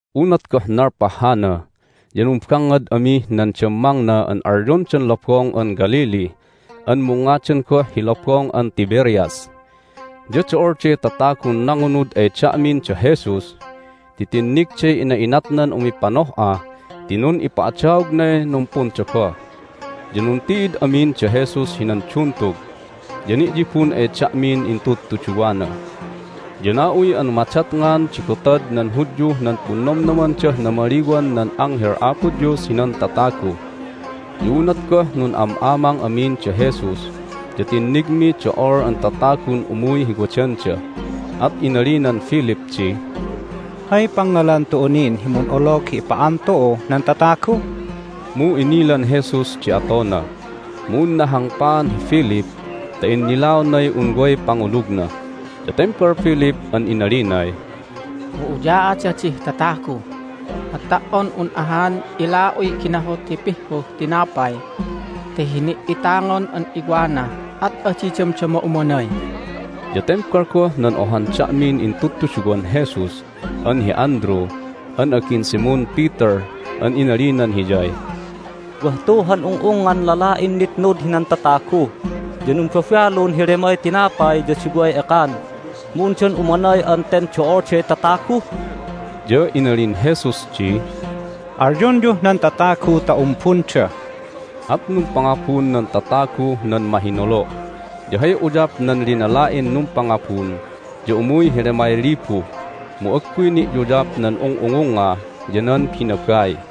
Unat goh nalpah hana ya numbangngad amih nan dammangna an alyondan Lobong an Galilee an mungngadan goh hi Lobong an Tiberias. Ya do'olday tatagun nangunud ay da'min da Jesus ti tinnigday ina'inatnan umipanoh'a ti nun'ipa'adaognay numpundogoh. Ya nunti'id amin da Jesus hinan duntug, ya ni'yibun ay da'min intudtuduwana. Ya na'uy an madatngan di gotad nan Hudyuh nan Punnomnomandah Namaliwan nan Anghel Apo Dios hinan Tatagu. Ya unat goh nun'am'amang amin da Jesus ya tinnigmiy do'ol an tatagun umuy hi wadanda, at inalinan Philip di, "Hay pangngalan tu'u nin hi mun'olog hi ipa'an tu'uh nan tatagu?" Mu inilan Jesus di atona, mu unna hangpaan hi Philip ta innilaonay un way pangulugna. Ya tembal Philip an inalinay, "Mu uya'ada dih tatagu, at ta"on un ahan ila'uy ginahut hi pihhuh tinapay ta hini"itangon an iwanah at adi damdama umanay!" Ya tembal goh nan ohan da'min intudtuduwan Jesus an hi Andrew an agin Simon Peter an inalinan hiyay, "Wah tu han ung'ungngan lala'in nitnud hinan tatagu, ya numbabalun hi lemay tinapay ya duway ekan. Mu undan umanay an ten do'olday tatagu?" Ya inalin Jesus di, "Alyonyuh nan tatagu ta umbunda." At numpangubun nan tataguh nan mahinolo'. Ya hay uyap nan linala'in numpangabun ya umuy hi lemay libu, mu agguy ni'yuyap nan ung'ungungnga ya nan binabai.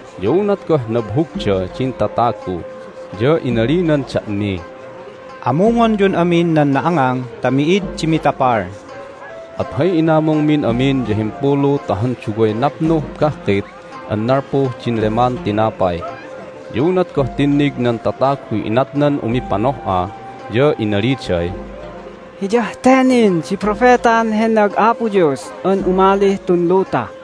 Ya unat goh nabhugda din tatagu ya inalinan da'miy, "Amungonyun amin nan na'angang ta mi'id di mitapal." At hay inamungmin amin ya himpulu ta han duway napnuh bahkit an nalpuh din leman tinapay. Ya unat goh tinnig nan tataguy inatnan umipanoh'a ya inaliday, "Hiyah te nin di Propetan hennag Apo Dios an umalih tun luta!"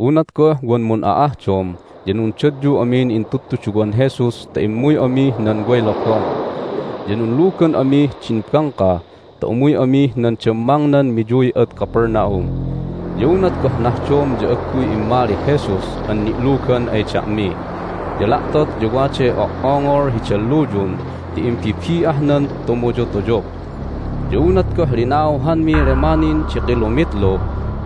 Unat goh wan mun'a'ahdom ya nundadyu amin intudtuduwan Jesus ta immuy amih nan way lobong, ya nunlugan amih din bangka ta umuy amih nan dammangnan miyuy ad Capernaum. Ya unat goh nahdom ya agguy immalih Jesus an ni'lugan ay da'mi. Ya la'tot ya waday o"ongol hi dalluyun ti imbibi'ahnan tumuyutuyup. Ya unat goh linauhanmiy lema nin di kilomitlu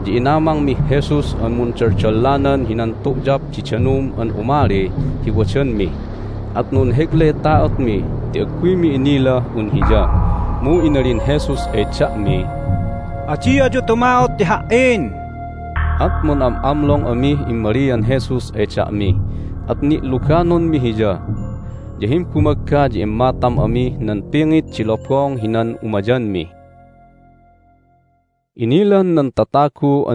ya inamangmih Jesus an mundaldallanan hinan tu'yap di danum an umali hi wadanmi, at nunheglay ta'otmi ti agguymi inilah un Hiya. Mu inalin Jesus ay da'miy, "Adi ayu tuma'ot ti Ha"in!" At mun'am'amlong amih immalian Jesus ay da'mi, at ni'luganonmi Hiya. Ya himbumagga ya immatam amih nan pingit di lobong hinan umayanmi. Hay Nanganapan nan Tatagun Jesus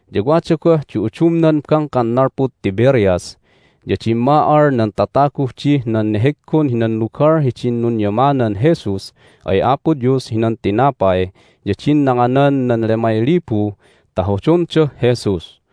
ya wada goh di udumnan bangkan nalpud Tiberias, ya dimma'al nan tataguh dih nan neheggon hinan lugal hidin nunyamanan Jesus ay Apo Dios hinan tinapay ya din nanganan nan lemay libu ta hodondah Jesus.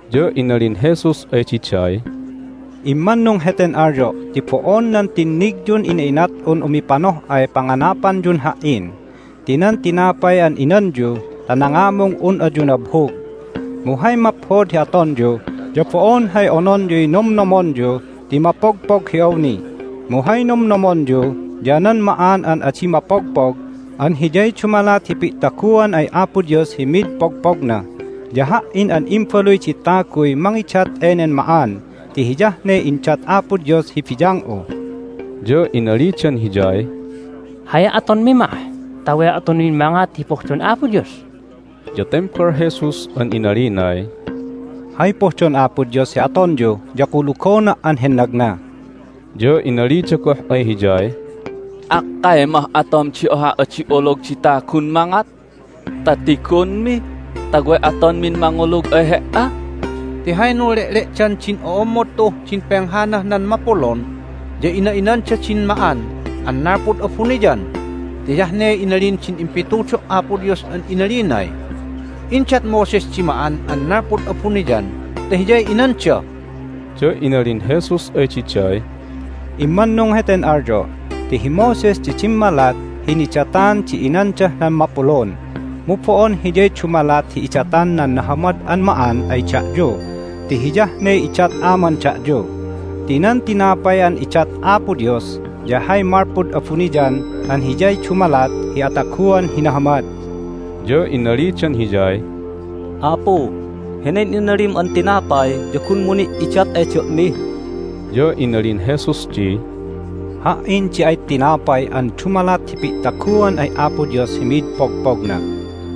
Ya inalin Jesus ay diday, "Immannung heten alyo' ti bo'on nan tinnigyun ina'inat'un umipanoh'ay panganapanyun Ha"in ti nan tinapay an inanyu ta nangamung un ayu nabhug. Mu hay maphod hi atonyu ya bo'on hay ononyuy nomnomonyu ti mapogpog hi awni, mu hay nomnomonyu ya nan ma'an an adi mapogpog an hiyay dumalat hi pi'taguan ay Apo Dios hi mid pogpogna. Ya Ha"in an Imbaluy di Taguy mangidat enen ma'an ti hiyah ne indat Apo Dios hi biyang'u." Ya inalidan Hiyay, "Hay atonmi mah ta way atonmin mangat hi pohdon Apo Dios?" Ya tembal Jesus an inalinay, "Hay pohdon Apo Dios hi atonyu ya kulugona' an hennagna." Ya inalida goh ay Hiyay, "Akkay mah atom di ohah adi olog di tagun mangat ta tigonmi ta way atonmin mangulug ay He"a? Ti hay nunle'le'dan din o'ommod tu'uh din penghanah nan mapulun ya ina'inanda din ma'an an nalpud abuniyan ti hiyah ne inalin din impitudo' Apo Dios an inalinay, Indat Moses di ma'an an nalpud abuniyan ta hiyay inanda." Ya inalin Jesus ay diday, "Immanung heten alyo' ti hi Moses di dimmalat hi nidatan di inandah nan mapulun, mu bo'on hiyay dumalat hi idatan nan nahamad an ma'an ay da'yu ti hiyah ne idat Aman da'yu. Ti nan tinapay an idat Apo Dios ya hay malpud abuniyan an hiyay dumalat hi ataguan hi nahamad." Ya inalidan Hiyay, "Apu, henen inalim an tinapay ya gunmu ni' idat ay da'mi!" Ya inalin Jesus di, "Ha"in di ay tinapay an dumalat hi pi'taguan ay Apo Dios hi mid pogpogna.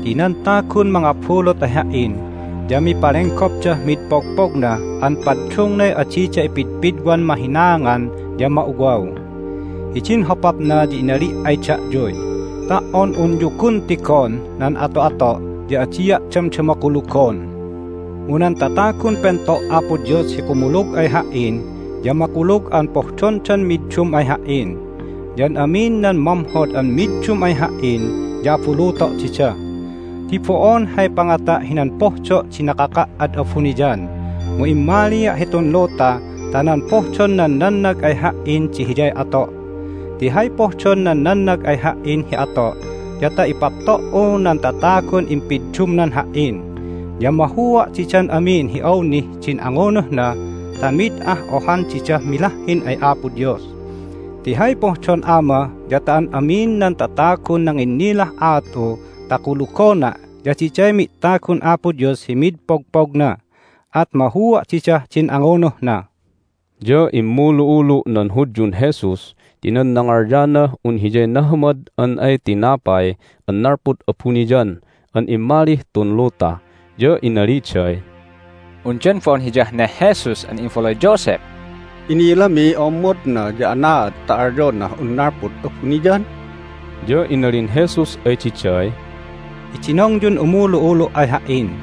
Ti nan tagun mangabulut ay Ha"in ya mipalenggopdah mid pogpogna an paddungnay adida ipidpidwan mahinaangan ya ma'uwaw. Hidin hopapna ya inali' ay da'yuy, Ta"on unyu gun tigon nan ato'ato' ya adia' damdama kulugon. Mu nan tatagun pento' Apo Dios hi kumulug ay Ha"in ya makulug an pohdondan middum ay Ha"in. Ya an amin nan mamhod an middum ay Ha"in ya abuluto' dida ti bo'on hay pangata' hinan pohdo' di nakaka' ad abuniyan, mu immalia' hitun luta ta nan pohdon nan nannag ay Ha"in di hiyay ato'. Ti hay pohdon nan nannag ay Ha"in hi ato' ya ta ipapto"u nan tatagun impiddumnan Ha"in, ya mahua' didan amin hi awnih din angunuhna ta mid ah ohan didah milahhin ay Apo Dios. Ti hay pohdon Ama ya ta an amin nan tatagun nanginnilah aat'u ta kulugona' ya diday mi'tagun Apo Dios hi mid pogpogna. At mahua' didah din angunuhna." Ya immulu'ulu' nan Hudyun Jesus ti nan nangalyanah un Hiyay nahamad an ay tinapay an nalpud abuniyan an immalih tun luta. Ya inaliday, "Undan bo'on Hiyah neh Jesus an imbaluy Joseph? Inilamiy o'ommodna, ya anaad ta alyonah un nalpud abuniyan?" Ya inalin Jesus ay diday, "Idinongyun umulu'ulu' ay Ha"in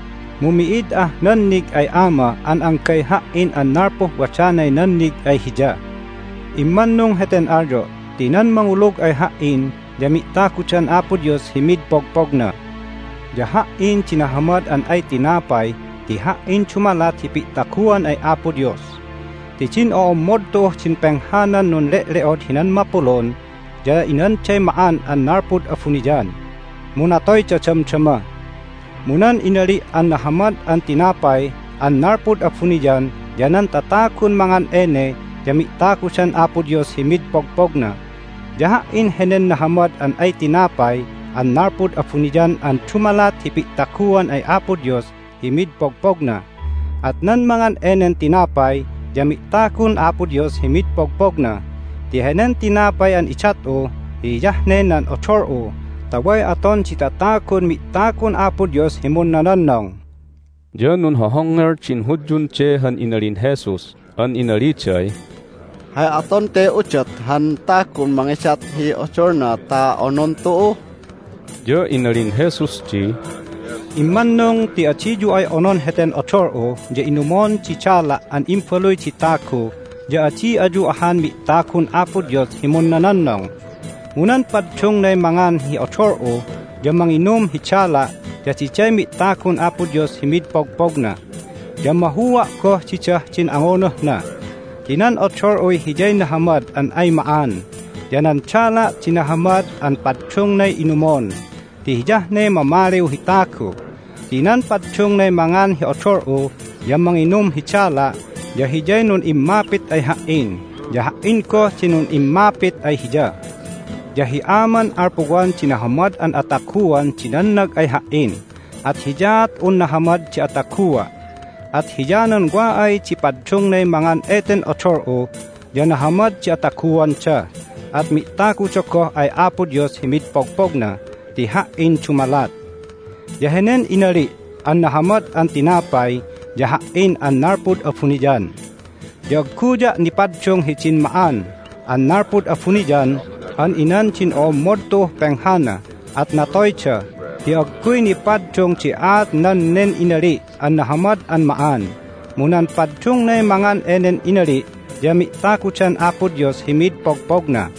Mu mi'id ah nannig ay Ama an anggay Ha"in an nalpuh wadanay nannig ay Hiya. Immannung heten alyo' ti nan mangulug ay Ha"in ya mi'tagudan Apo Dios hi mid pogpogna. Ya Ha"in di nahamad an ay tinapay ti Ha"in dumalat hi pi'taguan ay Apo Dios. Ti din o'ommod tu'uh din penghanan nunle'le'od hinan mapulun ya inanday ma'an an nalpud abuniyan, mu natoyda damdama. Mu nan inali' an nahamad an tinapay an nalpud abuniyan ya nan tatagun mangan ene ya mi'tagudan Apo Dios hi mid pogpogna. Ya Ha"in henen nahamad an ay tinapay an nalpud abuniyan an dumalat hi pi'taguan ay Apo Dios hi mid pogpogna. At nan mangan enen tinapay ya mi'tagun Apo Dios hi mid pogpogna. Ti henen tinapay an idat'u ya hiyah ne nan odol'u ta way aton di tatagun mi'tagun Apo Dios hi munnononnong." Ya nunhohongngel din Hudyun de han inalin Jesus an inaliday, "Hay aton te udot han tagun mangidat hi odolna ta onon tu'u?" Ya inalin Jesus di, "Immannung ti adiyu ay onon heten odol'u ya inumon di dala' an Imbaluy di Tagu ya adi ayu ahan mi'tagun Apo Dios hi munnononnong. Mu nan paddungnay mangan hi odol'u ya manginum hi dala' ya diday mi'tagun Apo Dios hi mid pogpogna. Ya mahua' goh didah din angunuhna. Ti nan odol'uy hiyay nahamad an ay ma'an, ya nan dala' di nahamad an paddungnay inumon, ti hiyah ne mamaliw hi tagu. Ti nan paddungnay mangan hi odol'u ya manginum hi dala' ya hiyay nun'immapit ay Ha"in, ya Ha"in goh di nun'immapit ay hiya. Ya hi Aman alpuwan di nahamad an ataguan di nannag ay Ha"in, at hiyaat un nahamad di atagua'. At hiyanan wa ay di paddungnay mangan eten odol'u ya nahamad di ataguanda, at mi'taguda goh ay Apo Dios hi mid pogpogna ti Ha"in dumalat. Ya henen inali' an nahamad an tinapay ya Ha"in an nalpud abuniyan. Ya agguya' nipaddung hidin ma'an an nalpud abuniyan an inan din o'ommod tu'uh penghana, at natoyda ti agguy nipaddung di aatnan nen inali' an nahamad an ma'an. Mu nan paddungnay mangan enen inali' ya mi'tagudan Apo Dios hi mid pogpogna."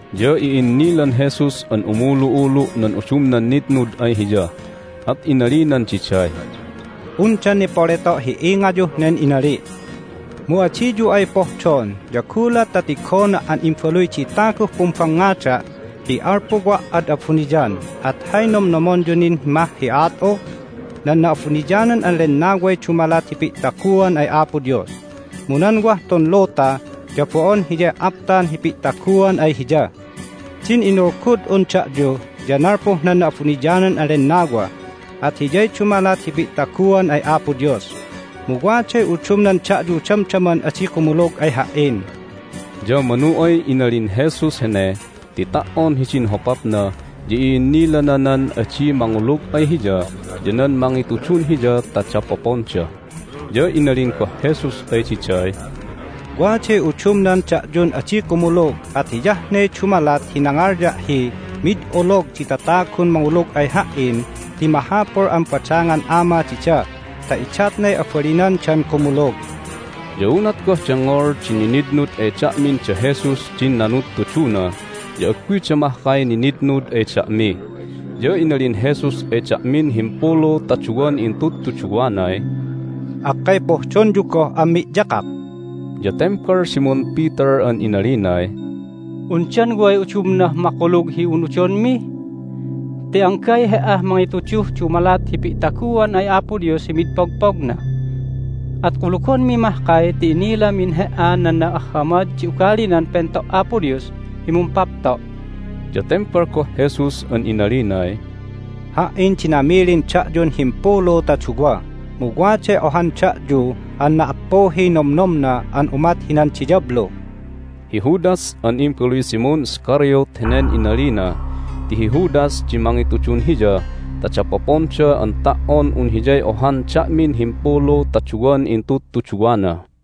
Ya i'innilan Jesus an umulu'ulu' nan udumnan nitnud ay Hiya, at inalinan diday, "Undan nipoleto' hi ingayuh nen inali'? Mu adiyu ay pohdon ya gulat ta tigona' an Imbaluy di Taguh pumbangngada' hi nalpuwa' an ad abuniyan at hay nomnomonyu nin mah hi aat'u? Nan Na'abuniyanan an Lennaway dumalat hi pi'taguan ay Apo Dios, mu nan wah tun luta ya bo'on hiyay aptan hi pi'taguan ay Hiya. Din inulgud'un da'yu ya nalpuh nan Na'abuniyanan an Lennawa, at hiyay dumalat hi pi'taguan ay Apo Dios. Mu waday udumnan da'yu damdaman adi kumulug ay Ha"in." Ya manu ay inalin Jesus hene ti ta"on hidin hopapna ya i'innilana nan adi mangulug ay Hiya ya nan mangitudun Hiya ta dapoponda. Ya inalin goh Jesus ay diday, "Waday udumnan da'yun adi kumulug at hiyah ne dumalat hi nangalya' hi, Mid olog di tatagun mangulug ay Ha"in ti mahapul an badangan Ama dida ta idatnay abalinandan kumulug." Ya unat goh dengngol din ninitnud ay da'min da Jesus din nanudtuduna ya agguyda mahkay nitnitnud ay da'mi. Ya inalin Jesus ay da'min himpulu ta duwan intudtuduwanay, "Akkay pohdonyu goh an mi'yakak?" Ya tembal Simon Peter an inalinay, "Undan way udumnah makulug hi unudonmi? Ti anggay He"ah mangituduh dumalat hi pi'taguan ay Apo Dios hi mid pogpogna! At kulugonmi mahkay ti inilamin He"a nan na'ahhamad di ugalinan Pento' Apo Dios hi mumpapto'!" Ya tembal goh Jesus an inalinay, "Ha"in di namilin da'yun himpulu ta duwa, mu waday ohan da'yu an na"appuhiy nomnomna an umat hinan diyablu!" Hi Judas an imbaluy Simon Iscariot henen inalina ti hi Judas di mangitudun Hiya ta dapoponda an ta"on un hiyay ohan da'min himpulu ta duwan intudtuduwana.